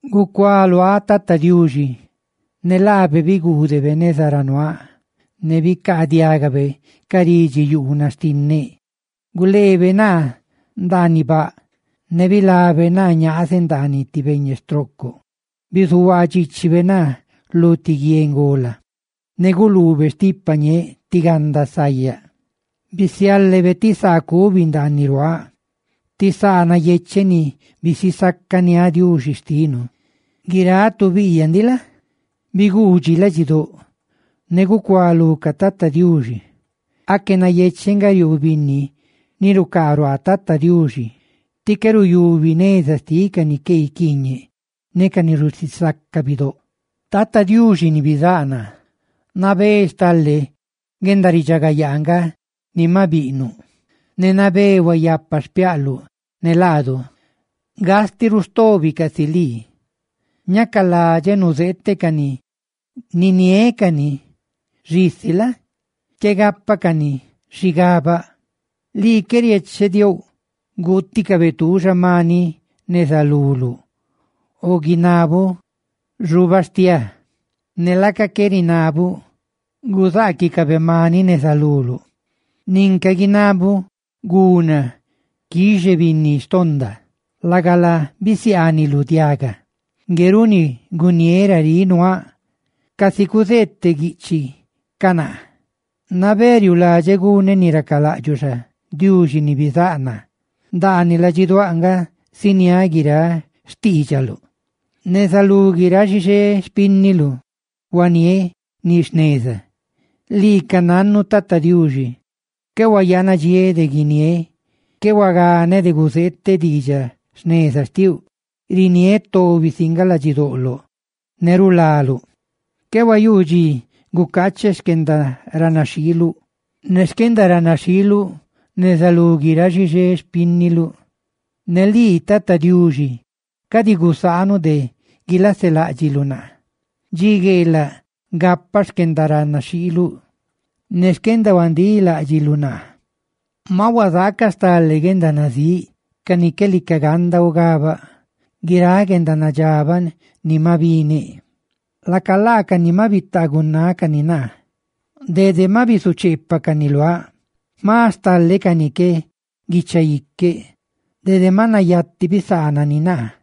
Gucualuáꞌ Tata Diuxi, ne laabe biguudebe neza ra nuaa ne bicaadiagabe ca ridxiyuunaꞌ xtinneꞌ; Guleebe naa ndaaniꞌ baꞌ, ne bilabe naa ñaazeꞌ ndaaniꞌ ti beñe stroocoꞌ. Bizuhuaa dxiichibe naa lu ti guie ngola; ne guluube stipa ñeeꞌ tí ganda sayaꞌ. Bisiálebe ti saa cubi ndaaniꞌ ruaaꞌ, ti saa nayecheꞌ ni bisisacaniáꞌ Diuxi xtinu. Guiráꞌ tu biꞌyaꞌ ndiꞌ la? biguudxi ladxidóꞌ, ne gucuá lucaꞌ Tata Diuxi. ¡Aque nayecheꞌ nga riuu binni ni rucaa ruaa Tata Diuxi ti qué ruyubi neza xtiꞌ ca ni qué guiquiiñeꞌ ne ca ni rusisaca bidóꞌ! Tata Diuxi ni bizáꞌ naa, nabé stale guendaridxagayaa nga ni maꞌ biꞌnuꞌ, ne nabé huayapa xpiaꞌluꞌ ne laadu. ¡Gastiꞌ ruꞌ stobi casi lii! Ñacaladxeꞌ nuzeeteꞌ cani, niniéꞌ cani, xisi la? qué gápacani xigabaꞌ. Lii qué riechediouꞌ guuticabe tuuxa maniꞌ neza luluꞌ o guinabuꞌ xubastiáa; ne laaca qué rinabaluꞌ guzaaquicabe maniꞌ neza luluꞌ ninca guinabuꞌ guna quixené binni xtonda. Lagala, bisiaaniluꞌ diagaꞌ. Ngue runi guniéꞌ: «Raríꞌ nuaaꞌ, casi cuzeeteꞌ guiꞌchiꞌ ca naa. Nabé riuuladxeꞌ guneꞌ ni racalaꞌdxuꞌ xa, Diuxi ni bizáꞌ naa; ¡ndaaniꞌ ladxiduáꞌ nga ziniáꞌ guiráꞌ xtiidxaluꞌ!» Neza lú guiráꞌ xixé xpínniluꞌ huaniéꞌ ni jneza. ¡Lii ca nannuꞌ, Tata Diuxi, qué hayanadxiéꞌ de guiniéꞌ!» Qué huaganeꞌ de guzeeteꞌ diidxaꞌ jneza xtiuꞌ; riniéꞌ tobi si nga ladxidoꞌloꞌ ne rulaluꞌ. Qué huayuu dxi gucaacheꞌ xquendaranaxhiiluꞌ ne xquendadxandiluꞌ neza lú guiráꞌ xixé xpínniluꞌ. Ne lii, Tata Diuxi, ¡cadi gusaanuꞌ de guilaseláꞌdxiluꞌ naa! ¡Dxi gueelaꞌ gapaꞌ xquendaranaxhiiluꞌ ne xquendahuandíꞌ láꞌdxiluꞌ naa! Maꞌ huazaacaꞌ stale guendanazíꞌ ca ni qué lica ganda ugabaꞌ. Guiráꞌ guendanadxabaꞌ ni maꞌ bineꞌ; laca laacani maꞌ bitagunácani naa; ¡dede maꞌ bisucheepacani luáꞌ! Jma stale cani que guicha iqueꞌ, dede maꞌ nayati bisaanani naa.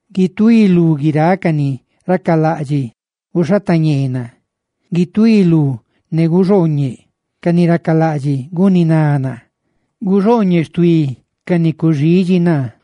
¡Guituí lú guiráꞌ ca ni racalaꞌdxiꞌ guxhatañee naa! ¡Guituí lú ne guxooñeꞌ ca ni racalaꞌdxiꞌ guniná naa! ¡Guxooñeꞌ xtuí ca ni cuxidxi naa!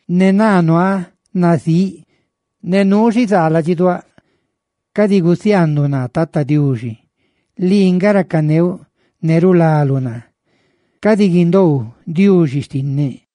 Ne naa, nuaa nazíꞌ ne nuu xizaa ladxiduáꞌ, cadi gusiaanduꞌ naa, Tata Diuxi. Lii nga racaneuꞌ ne rulaluꞌ naa; ¡cadi guindoou, Diuxi xtinneꞌ!